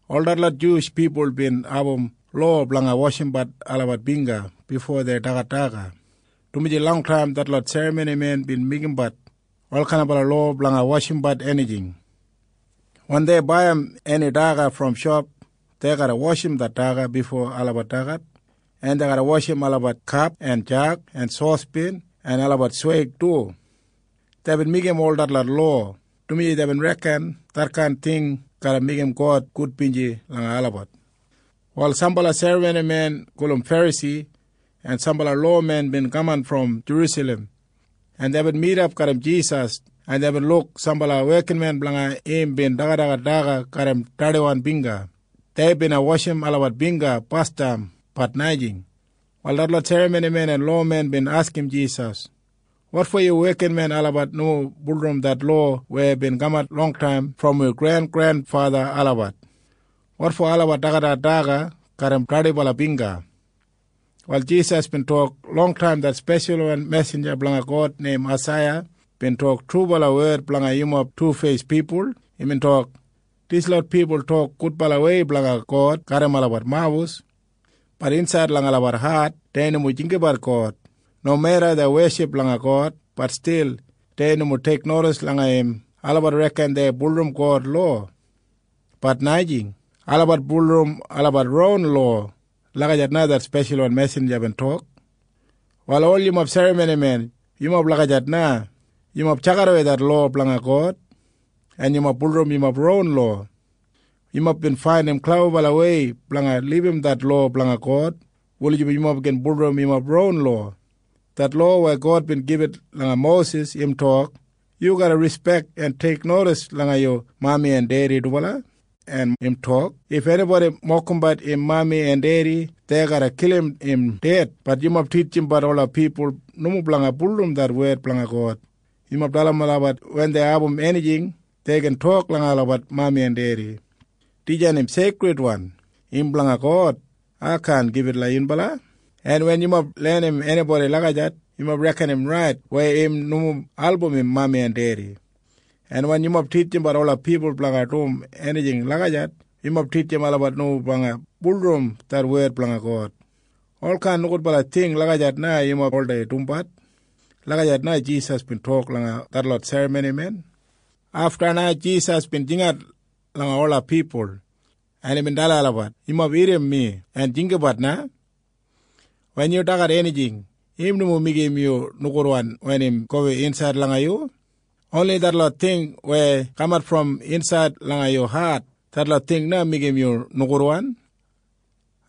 Ol detlot Juwish pipul bin abum lowa blanga washimbat olabat bingga bifo dei dagat daga, dumaji longtaim detlot serramonimen bin meigimbat olkain lowa blanga washimbat enijing. Wen dei baiyim eni daga brom shop, dei garra washim det daga bifo olabat dagat, en dei garra washimbat olabat kap en jag en sospen en olabat sweig du. Deibin meigimbat ol detlot lowa, dumaji deibin reken detkain ting garra meigim God gudbinji langa olabat. Wal sambala serramonimen gulum Ferasi en sambala lowamen bin kaman brom Jerusalem, en deibin midap garram Jisas, en deibin luk sambala wekinmen blanga im bin dagadagat daga garram dardiwan bingga. Dei bina washim olabat bingga basdam. Bat najing. Wal detlot serramonimen en lowamen bin askim Jisas, “Wotfo yu wekinmen olabat nomo bulurrum det lowa weya bin kamat longtaim brom wi grengrenfatha olabat? Wotfo olabat dagadagat daga garram dardiwan bingga?” Wal Jisas bin tok, “Longtaim det speshalwan mesinja blanga God neim Aisaiya bin tok trubala wed blanga yumob tufeis pipul. Imbin tok, ‘Dislot pipul tok gudbalawei blanga God garram olabat mawus. Bat insaid langa olabat hat dei nomo jinggabat God. Nomeda dei weship langa God, bat stil dei nomo teiknodis langa im. Olabat reken dei bulurrum God lowa. Bat najing. Olabat bulurrum olabat ron lowa.’ Lagijat na det speshalwan mesinja bin tok. “Wal ol yumob serramonimen, yumob lagijat na. Yumob tjakidawei det lowa blanga God, en yumob bulurrum yumob ron lowa. Yumob bin faindim klebabalawei blanga libum det lowa blanga God wulijim yumob gin bulurrum yumob ron lowa. Det lowa weya God bin gibit langa Mosis im tok, ‘Yu garra rispek en teiknodis langa yu mami en dedi dubala.’ En im tok, ‘If enibodi mokimbat im mami en dedi, dei garra kilim im ded.’ Bat yumob titjimbat ola pipul nomo blanga bulurrum det wed blanga God. Yumob dalim olabat wen dei abum enijing, dei gin tok langa olabat mami en dedi, ‘Dijan im seikridwan. Im blanga God. Ai kaan gibit yunbala.’ En wen yumob lenim enibodi lagijat, yumob reken im rait weya im nomo album im mami en dedi. En wen yumob titjim ola pipul blanga dum enijing lagijat, yumob titjim olabat nomo blanga bulurrum det wed blanga God. Olkain nogudbala ting lagijat na yumob oldei dumbat.” Lagijat na Jisas bin tok langa detlot serramonimen. Afta na Jisas bin jingat langa ola pipul, en imbin dalim olabat, “Yumob irrim mi en jinggabat na. Wen yumob dagat enijing, im nomo meigim yumob nogudwan wen im gowin insaid langa yumob. Oni detlot ting weya kamat brom insaid langa yumob hat, detlot ting na meigim yumob nogudwan.”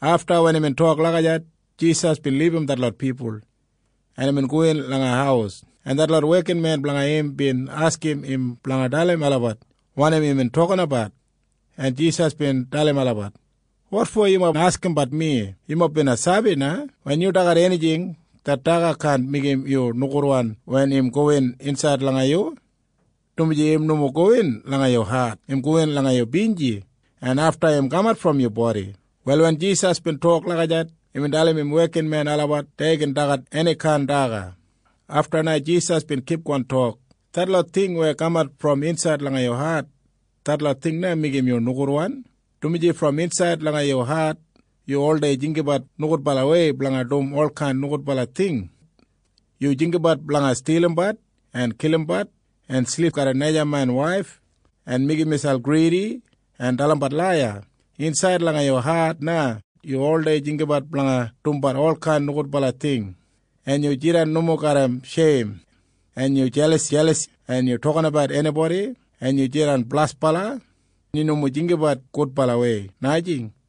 Afta wen imbin tok lagijat, Jisas bin libum detlot pipul, en imbin gowin langa haus, en detlot wekinmen blanga im bin askim im blanga dalim olabat wanim imbin toktok, en Jisas bin dalim olabat, “Wotfo yumob askimbat mi? Yumob bina sabi na. Wen yumob dagat enijing, det daga kaan meigim yu nogudwan wen im gowin insaid langa yumob, dumaji im nomo gowin langa yumob hat. Im gowin langa yumob binji, en afta im kamat brom yumob bodi.” Wal wen Jisas bin tok lagijat, imbin dalim im wekinmen olabat dei gin dagat enikain daga. Afta na Jisas bin kipgon tok, “Detlot ting weya kamat brom insaid langa yumob hat, detlot ting na meigim yumob nogudwan, dumaji brom insaid langa yumob hat yumob oldei jinggabat nogudbalawei blanga dum olkain nogudbala ting. Yumob jinggabat blanga stilimbat en kilimbat en silipsilip garram najamen waif en meigim miselp gridi en dalimbat laiya. Insaid langa yumob hat na yumob oldei jinggabat blanga dumbat olkain nogudbala ting, en yumob jidan nomo garram sheim, en yumob jelasjelas, en yumob tokinabat enibodi, en yumob jidan blasbala. Yumob nomo jinggabat gudbalawei, najing.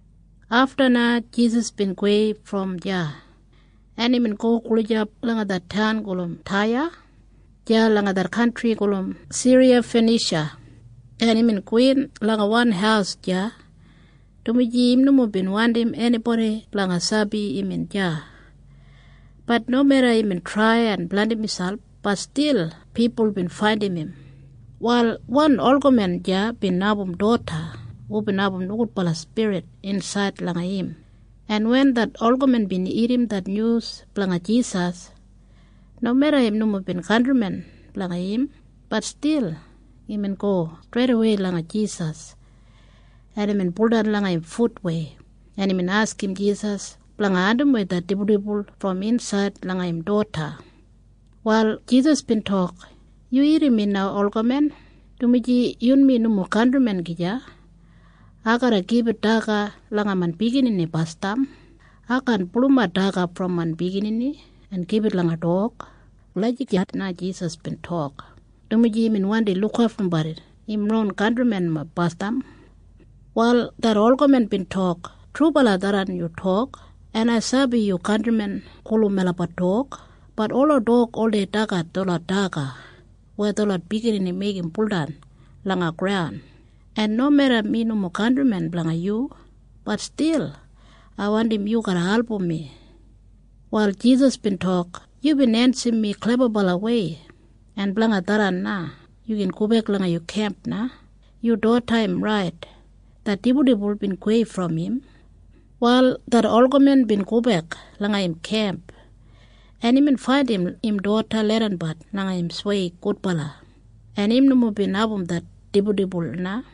Afta na Jisas bin gowei brom deya, en imbin go gulijap langa det taun gulum Taya deya langa det kantri gulum Siriyafanisha, en imbin gowin langa wan haus deya, dumaji im nomo bin wandim enibodi blanga sabi imbin deya. Bat nomeda imbin trai en blandim miselp, bat stil pipul bin faindim im. Wal wan olgamen deya bin abum doda hubin abum nogudbala spirit insaid langa im, en wen det olgamen bin irrim det nyus blanga Jisas, nomeda im nomo bin kantrimen blanga im, bat stil imbin go streidawei langa Jisas, en imbin baudan langa im futwei, en imbin askim Jisas blanga andimwei det dibuldibul brom insaid langa im doda. Wal Jisas bin tok, “Yu irrim mi na, olgamen, dumaji yunmi nomo kantrimen gija. Ai garra gibit daga langa main biginini basdam. Ai kaan pulumat daga brom main biginini en gibit langa dog.” Lagijat na Jisas bin tok, dumaji imbin wandi lukaftumbat im ron kantrimen basdam. Wal det olgamen bin tok, “Trubala tharran yu tok. En ai sabi yu kantrimen gulum melabat dog. Bat ola dog oldei dagat detlot daga weya detlot biginini meigim buldan langa graun. En nomeda mi nomo kantrimen blanga yu, bat stil ai wandim yu garra album mi.” Wal Jisas bin tok, “Dumaji yubin ensim mi klebawei yu gin gobek langa yu kemp na. Yu doda im rait. Det dibuldibul bin gowei brom im.” Wal det olgamen bin gobek langa im kemp, en imbin faindim im doda leidanbat langa im sweig gudbala, en im nomo bin abum det dibuldibul na.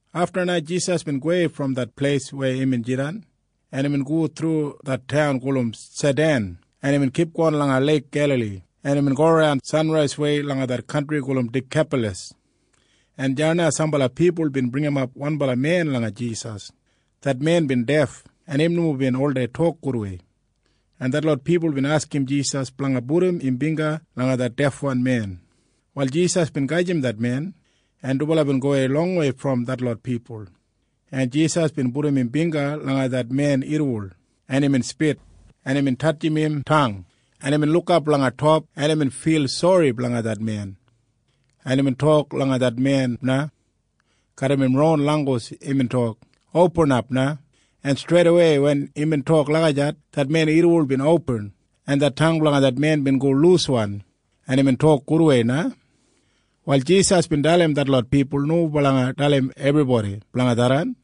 Afta na Jisas bin gowei brom det pleis weya imbin jidan, en imbin go thru det taun gulum Saidan, en imbin kipgon langa Leik Gelali, en imbin goran sanraiswei langa det kantri gulum Dikapalas, en deya na sambala pipul bin bringimap wanbala men langa Jisas. Det men bin def, en im nomo bin oldei tok gudwei, en detlot pipul bin askim Jisas blanga pudum im bingga langa det defwan men. Wal Jisas bin gajim det men, en dubala bin gowei longwei brom detlot pipul, en Jisas bin pudum im bingga langa det men irriwol, en imbin spit, en imbin tatjim im tang, en imbin lukap langa top, en imbin fil sori blanga det men, en imbin tok langa det men na. Garram im ron langgus imbin tok, “Opinap na.” En streidawei wen imbin tok lagijat, det men irriwol bin opin, en det tang blanga im bin go luswan, en imbin tok gudwei na. Wal Jisas bin dalim detlot pipul nomo blanga dalim enibodi blanga tharran.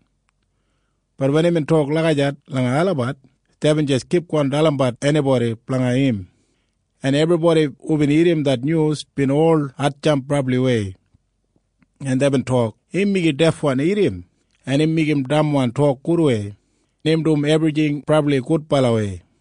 Bat wen imbin tok lagijat langa olabat, deibin jis kipgon dalimbat enibodi blanga im, en ebribodi hubin irrim det nyus bin ol hatjamp brabliwei, en deibin tok, “Im meigim defwan irrim, en im meigim damwan tok gudwei. Im dum ebrijing brabli gudbalawei.”